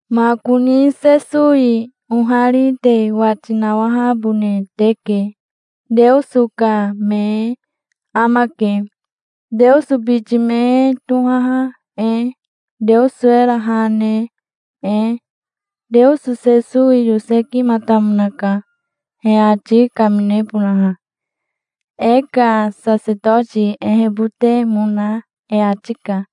Makoni Sesowi ohari te wati nawahabone teke. Teoso ka me e amake, Teoso biti me e tohaha e, Teoso era ha ne e. Teoso Sesowi yosekimatamonaka, he ati kaminebonaha. E ka sasetoti ehebotemona e ati ka.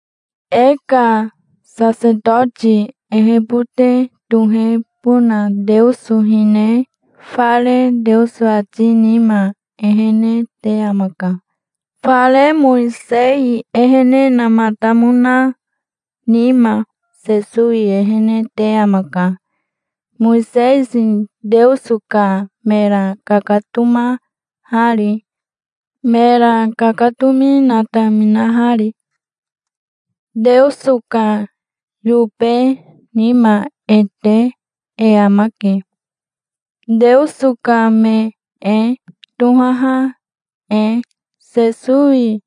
E ka sasetoti ehebote tohebona Teoso hine fare Teoso ati nima ehene te amaka. Fare Mowisei ehenematamona nima Sesowi ehene te amaka, Mowisei Teoso ka mera kakatomahari, mera kakatomi nataminahari. Teoso ka yobe nima e te e amake, Teoso ka me e tohaha e. Sesowi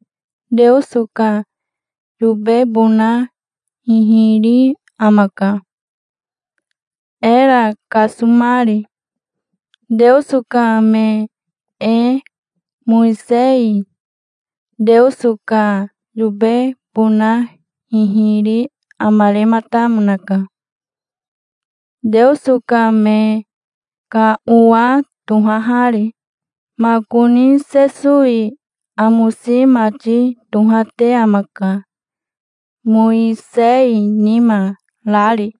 Teoso ka yobebona hihiri amaka, era kasomari, Teoso ka me e. Mowisei Teoso ka yobebona hihiri amarematamonaka, Teoso ka me ka owa tohahari. Makoni Sesowi amosi mati tohate amaka, Mowisei nima rari.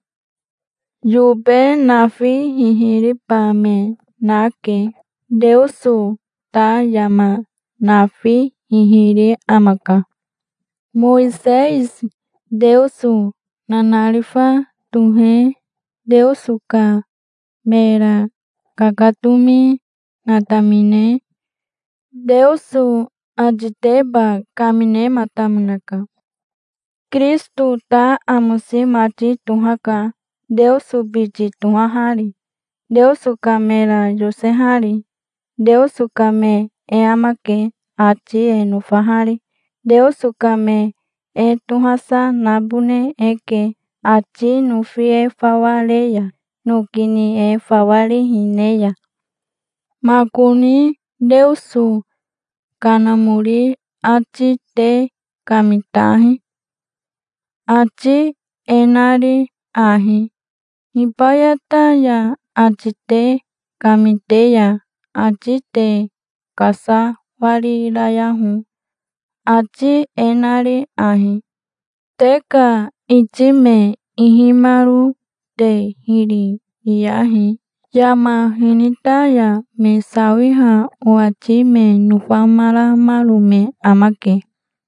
Yobe nafi hihiriba me nake. Teoso ta yama nafi hihiri amaka. Mowisei Teoso nanarifa tohe Teoso ka mera kakatomi natamine Teoso atiteba kaminematamonaka. Kirisito ta amosi mati tohaka, Teoso biti tohahari, Teoso ka mera yosehari. Teoso ka me e amake, ati e nofahari. Teoso ka me e tohasa nabone eke, ati nofi e fawa re ya, noki ni e fawa rihi ne ya. Makoni Teoso Kanamori ati te kamitahi, ati e nari ahi: "Hibayata ya ati te kamite ya ati te kasawarirayaho, ati e nari ahi: 'Te ka iti me ihimaro te hiri riyahi. Yama hinita ya me sawiha owati me nofamaramaro me amake.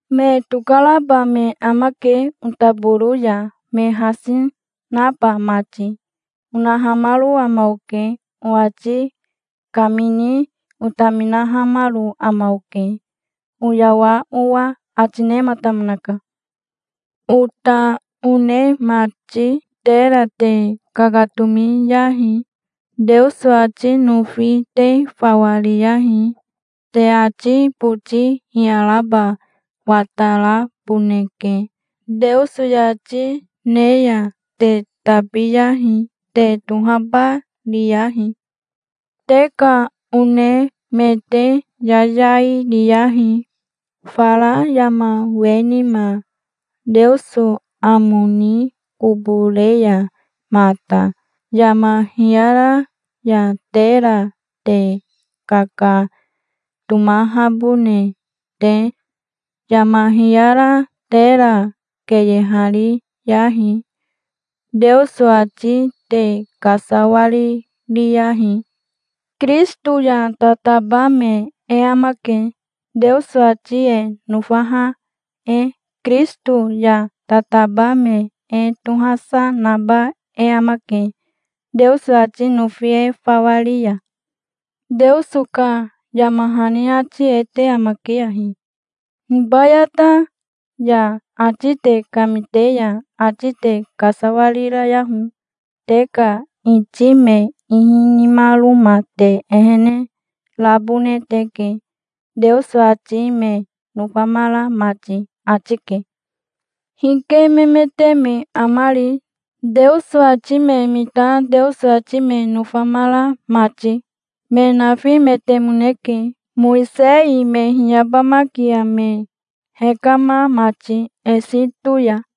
Me tokaraba me amake otaboro ya, me hasi naba mati", onahamaro ama oke. Owati kamini otaminahamaro ama oke, oyawa owa', ati nematamonaka". Ota one mati, tera te kakatomiyahi. Teoso ati nofi te fawa riyahi. Te ati boti hiyaraba wataraboneke. Teoso yati ne ya te tabiyahi. Te tohaba riyahi. Te ka one me te yayai niyahi, fara yama we nima, Teoso amo ni kobo re ya mata, yama hiyara ya tera te kakatomahabone te. Yama hiyara tera keyehariyahi. Teoso ati te kasawaririyahi. Kirisito ya tataba me e amake, Teoso ati e nofaha e. Kirisito ya tataba me e tohasa naba e amake, Teoso ati nofi e fawa ri ya. Teoso ka yama hani ati e te amake ahi: "Hibayata ya ati te kamite ya ati te kasawarirayaho. Te ka iti me ihi nimaroma te ehene rabone teke, Teoso ati me nofamara mati", ati ke. Hike memete me amari, Teoso ati me mita Teoso ati me nofamara mati? Me nafimetemoneke, Mowisei me hiyabamakia me hekama mati Esito ya.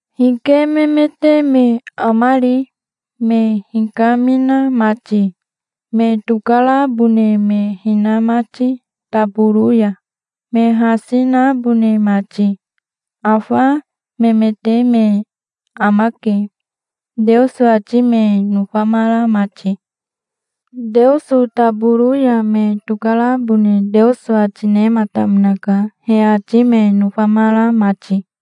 Hike memete me amari, me hikamina mati, me tokarabone me hina mati taboro ya, me hasi nabone mati? Afa memete me amake, Teoso ati me nofamara mati. Teoso taboro ya me tokarabone Teoso ati nematamonaka, he ati me nofamara mati.